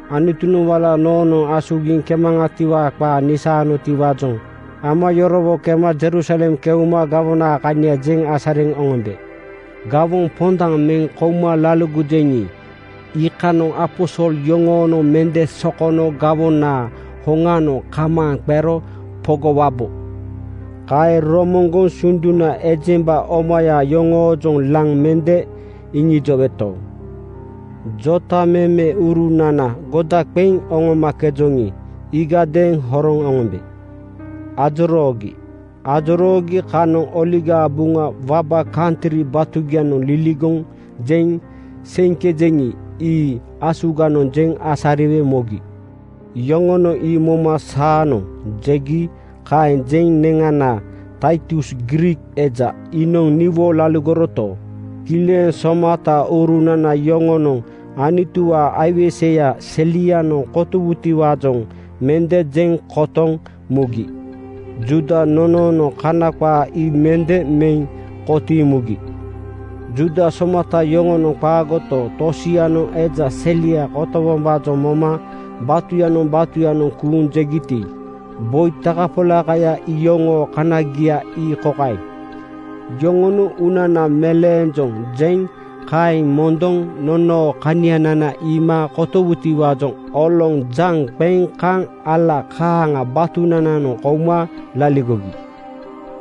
Anutunoŋ wala noonoŋ asugiŋ kemaŋatiwaa qaa nisaanotiwaajoŋ ama yorowo kema Jerusalem keuma gawonaa kania jeŋ asariŋ oŋombe. Gawoŋ pondaŋ meŋ kouma laligojeŋi, iikanoŋ aposol yoŋoonoŋ mende sokono gawonaa hoŋanoŋ kamaaŋ qero pogowabo. Kaeŋ romoŋgoŋ sunduna ejemba omaya yoŋoojoŋ laŋ mende iŋijoweto, jotamemeurunana goda qeŋ oŋomakejoŋi, iigadeeŋ horoŋ oŋombe ajoroogi. Ajoroogi kanoŋ Oligaa Buŋa waba kantri batugianoŋ liligoŋ jeŋ seiŋkejeŋi, ii asuganoŋ jeŋ asariwe mogi. Yoŋonoŋ ii moma “Saanoŋ!” jegi. Kaeŋ jeŋ neŋana Taitus Griik eja iinoŋ niwo laligoroto, kileŋ somataurunana yoŋonoŋ Anutuwaa aiweseya selianoŋ kotowutiwaajoŋ mende jeŋ kotoŋ mugi. Juuda nonoonoŋ Kana qaa ii mende meŋ kotiiŋ mugi. Juuda somata yoŋonoŋ qaagoto, tosianoŋ eja selia kotowombaajoŋ moma batuyanoŋ batuyanoŋ kuuŋ jegiti, boi takapolakaya iyoŋoo kanagia ii kokaeŋ: Yoŋonoŋ “Uunana meleenjoŋ,” jeŋ kaeŋ mondoŋ nonoo kanianana iima kotowutiwaajoŋ oloŋ jaŋ qeŋ kaŋ ala kaaŋa batunananoŋ kouma laligogi.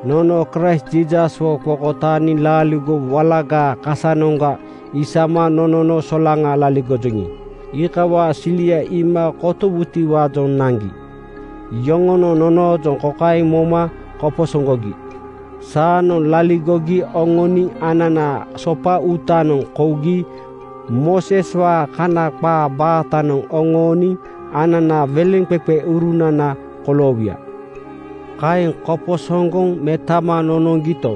Nono Kraist Jiisaswo qokotaaniŋ laaligo walagaa kasanoŋga isama nonono solaŋa laligojoŋi, iikawaa silia iima kotowutiwaajoŋ naŋgi. Yoŋonoŋ nonoojoŋ kokaeŋ moma koposoŋgogi: Saanoŋ laligogi oŋoniŋ ananaa sopa uutanoŋ kougi Mooseswaa Kana qaa baatanoŋ oŋooniŋ ananaa weleŋqeqeurunana koloowuya. Kaeŋ koposoŋgoŋ metama nonoŋgito,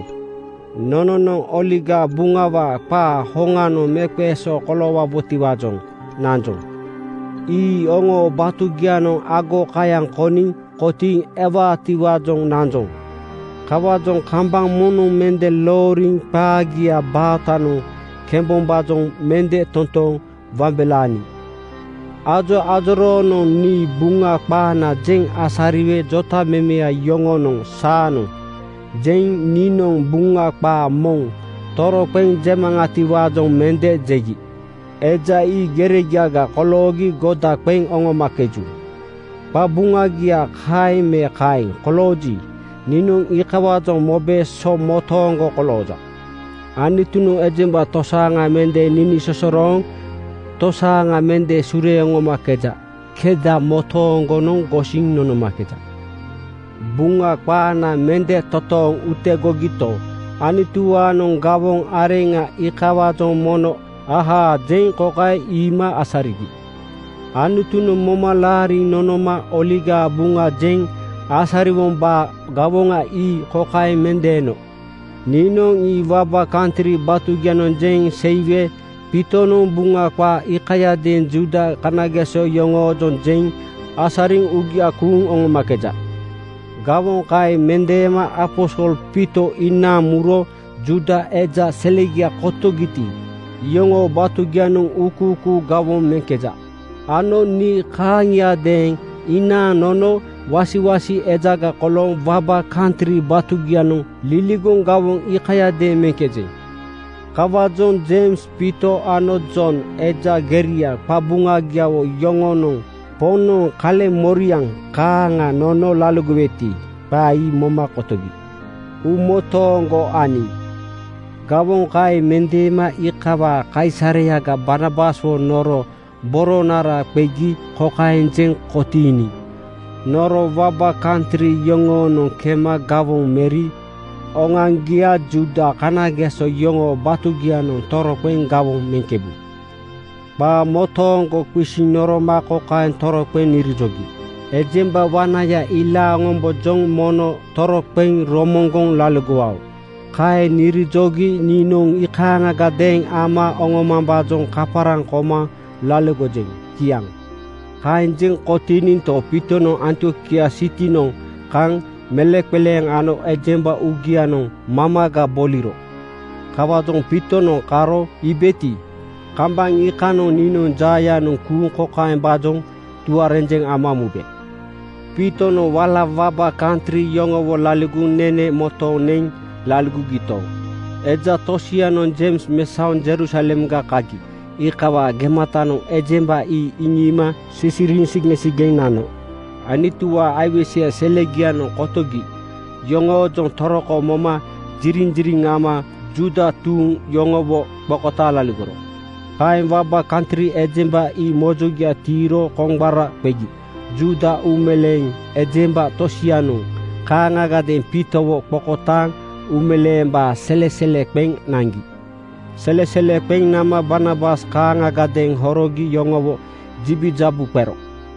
nononoŋ Oligaa Buŋawaa qaa hoŋanoŋ meeqeesoo koloowabotiwaajoŋ nanjoŋ. Ii oŋoo batugianoŋ agokayaŋ koniŋ kotiiŋ ewaatiwaajoŋ nanjoŋ. Kawaajoŋ kambaŋ moŋnoŋ mende looriŋ qaagiaa baatanoŋ kembombaajoŋ mende totooŋ wambelaaniŋ. Ajoajoroonoŋ nii Buŋa qaana jeŋ asariwe jotamemeya yoŋonoŋ “Saanoŋ!” jeŋ niinoŋ Buŋa qaa moŋ toroqeŋ jemaŋatiwaajoŋ mende jegi. Eja ii geregiaga koloogi goda qeŋ oŋomakeju. Qabuŋagia kaeŋ me kaeŋ kolooji, niinoŋ iikawaajoŋ mobe so motooŋgo kolooja. Anutunoŋ ejemba tosaaŋa mende ninisosorooŋ tosaaŋa mende sureeŋ oŋomakeja. Keda motooŋgonoŋ gosiŋ nonomakeja. Buŋa qaana mende totooŋ utegogito, Anutuwaanoŋ gawoŋ areŋa iikawaajoŋ mono “Ahaa!” jeŋ kokaeŋ iima asarigi: Anutunoŋ moma laariŋ nonoma Oligaa Buŋa jeŋ asariwombaa gawoŋa ii kokaeŋ mendeeno: Niinoŋ ii waba kantri batugianoŋ jeŋ seiwe Piitonoŋ Buŋa qaa iikayadeeŋ Juuda kanageso yoŋoojoŋ jeŋ asariŋ uugia kuuŋ oŋomakeja. Gawoŋa kaeŋ mendeema aposol Piito inaaŋ muro Juuda eja selegia kotogiti, iyoŋoo batugianoŋ uukuukuu gawoŋ meŋkeja ano nii kaaŋiadeeŋ inaaŋ nono wasiwasi ejaga kolooŋ waba kantri batugianoŋ liligoŋ gawoŋ iikayadeeŋ meŋkejeŋ. Kawaajoŋ Jeims, Piito ano Jon, eja geria qabuŋagiawo yoŋonoŋ Poŋnoŋ kaleŋmoriaŋ kaaŋa nono laligoweti, qaa ii moma kotogi uumotooŋgo aniŋ. Gawoŋ kaeŋ mendeema iikawaa kaisareyaga Barnabaswo noro boronara qegi kokaeŋ jeŋ kotiiniŋ, “Noro waba kantri yoŋoonoŋ kema gawoŋ meri oŋoaŋgia Juuda kanageso yoŋoo batugianoŋ toroqeŋ gawoŋ meŋkebu.” Qaa motooŋgo qisiŋ noroma kokaeŋ toroqeŋ nirijogi, “Ejemba wanaya ilaaŋ oŋombojoŋ mono toroqeŋ romoŋgoŋ laligowao.” Kaeŋ nirijogi niinoŋ iikaaŋagadeeŋ ama oŋomambaajoŋ kaparaŋ koma laligojeŋ. Kiaŋ. Kaeŋ jeŋ kotiininto, Piitonoŋ Antiokia sitinoŋ kaŋ meleŋqeleeŋ ano ejemba uugianoŋ mamaga boliro. Kawaajoŋ Piitonoŋ karo iibeti, kambaŋ iikanoŋ niinoŋ jaayanoŋ kuuŋ kokaembaajoŋ tuarenjeŋ ama mube: Piitonoŋ wala waba kantri yoŋowo laligoŋ nene motooŋ neŋ laligogito, eja tosianoŋ Jeims mesaoŋ Jerusalemga kagi iikawaa gematanoŋ ejemba ii iŋiima sisiriiŋ sigeŋsigeŋ nano. Anutuwaa aiweseya selegianoŋ kotogi yoŋoojoŋ toroko moma ziriŋziriŋ ama Juuda tuuŋ yoŋowo qokotaaŋ laligoro. Kaeŋ waba kantri ejemba ii mojogia tiiro koŋgbara qegi Juuda uumeleeŋ ejemba tosianoŋ kaaŋagadeeŋ Piitowo qokotaaŋ uumeleembaa selesele qeŋ naŋgi. Selesele qeŋ nama Barnabas kaaŋagadeeŋ horogi yoŋowo jibijabu qero.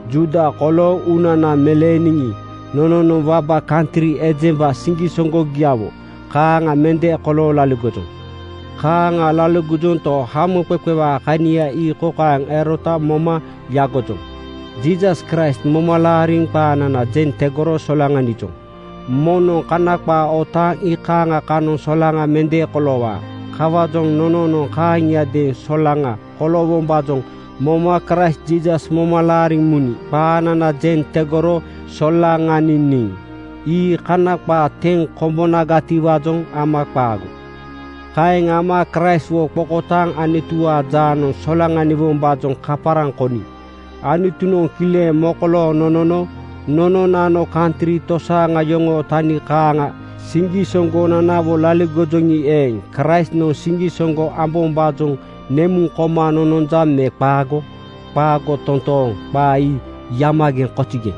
Juuda kolooŋ uunana meleeniŋi, nononoŋ waba kantri ejemba siŋgisoŋgogiawo kaaŋa mende kolooŋ laligojoŋ. Kaaŋa laligojonto, hamoqeqewaa kania ii kokaeŋ erota moma yagojoŋ: Jiisas Kraist moma laariniŋ qaanana jeŋ tegoro solaŋanijoŋ. Moŋnoŋ Kana qaa otaaŋ iikaaŋa kanoŋ solaŋa mende koloowaa. Kawaajoŋ nononoŋ kaaŋiadeeŋ solaŋa koloowombaajoŋ moma Kraist Jiisas moma laariŋ muniŋ qaanana jeŋ tegoro solaŋaniniŋ. Ii Kana qaa teŋ kombonagatiwaajoŋ ama qaago. Kaeŋ ama Kraistwo qokotaaŋ Anutuwaa jaanoŋ solaŋaniwombaajoŋ kaparaŋ koniŋ Anutunoŋ kileŋ mokolooŋ nonono nononano kantri tosaaŋa yoŋoo tani kaaŋa siŋgisoŋgonanawo laligojoŋi eeŋ, Kraistnoŋ siŋgisoŋgo ambombaajoŋ nemuŋ koma nononja me qaago? Qaago totooŋ! Qaa ii yamageŋ (kozigeŋ)!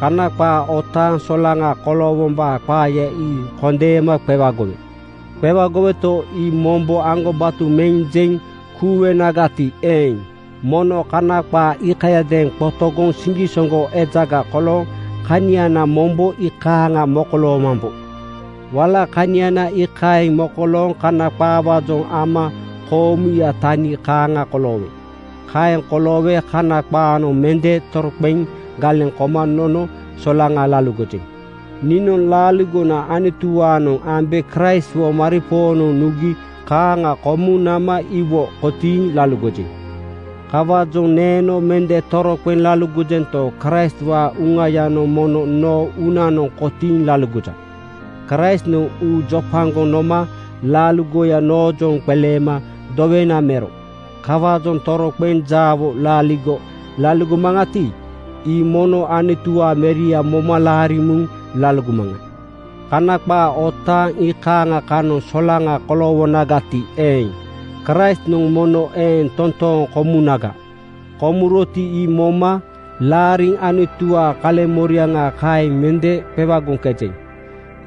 Kana qaa otaaŋ solaŋa koloowombaa qaaya ii kondeema qewagowe. Qewagoweto, ii mombo aŋgobato meŋ jeŋ kuuwenagati eeŋ, mono Kana qaa iikayadeeŋ qotogoŋ siŋgisoŋgo ejaga kolooŋ kaniana mombo iikaeŋ mokoloomambo. Wala kaniana iikaeŋ mokolooŋ Kana qaawaajoŋ ama koomuya tani kaaŋa koloowe. Kaeŋ koloowe Kana qaanoŋ mende toroqeŋ galeŋ koma nono solaŋa laligojeŋ. Niinoŋ laaligona Anutuwaanoŋ ambe Kraistwo maripoonoŋ nugi kaaŋa komuŋ nama iwo kotiiŋ laligojeŋ. Kawaajoŋ neeno mende toroqeŋ laligojento, Kraistwaa Uŋayanoŋ mono noo uunanoŋ kotiiŋ laligoja. Kraistnoŋ uu jopagoŋ noma laaligoya noojoŋ qeleema dowena mero. Kawaajoŋ toroqeŋ jaawo laaligo laligomaŋati, ii mono Anutuwaa Meria moma laariŋ muŋ laligomaŋa. Kana qaa otaaŋ iikaaŋa kanoŋ solaŋa koloowonagati eeŋ, Kraistnoŋ mono eeŋ toontooŋ komunaga. Komuroti, ii moma laariŋ Anutuwaa kaleŋmoriaŋa kaeŋ mende qewagoŋkejeŋ.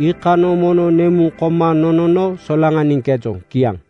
Iikanoŋ mono nemuŋ koma nonono solaŋaniŋkejoŋ. Kiaŋ.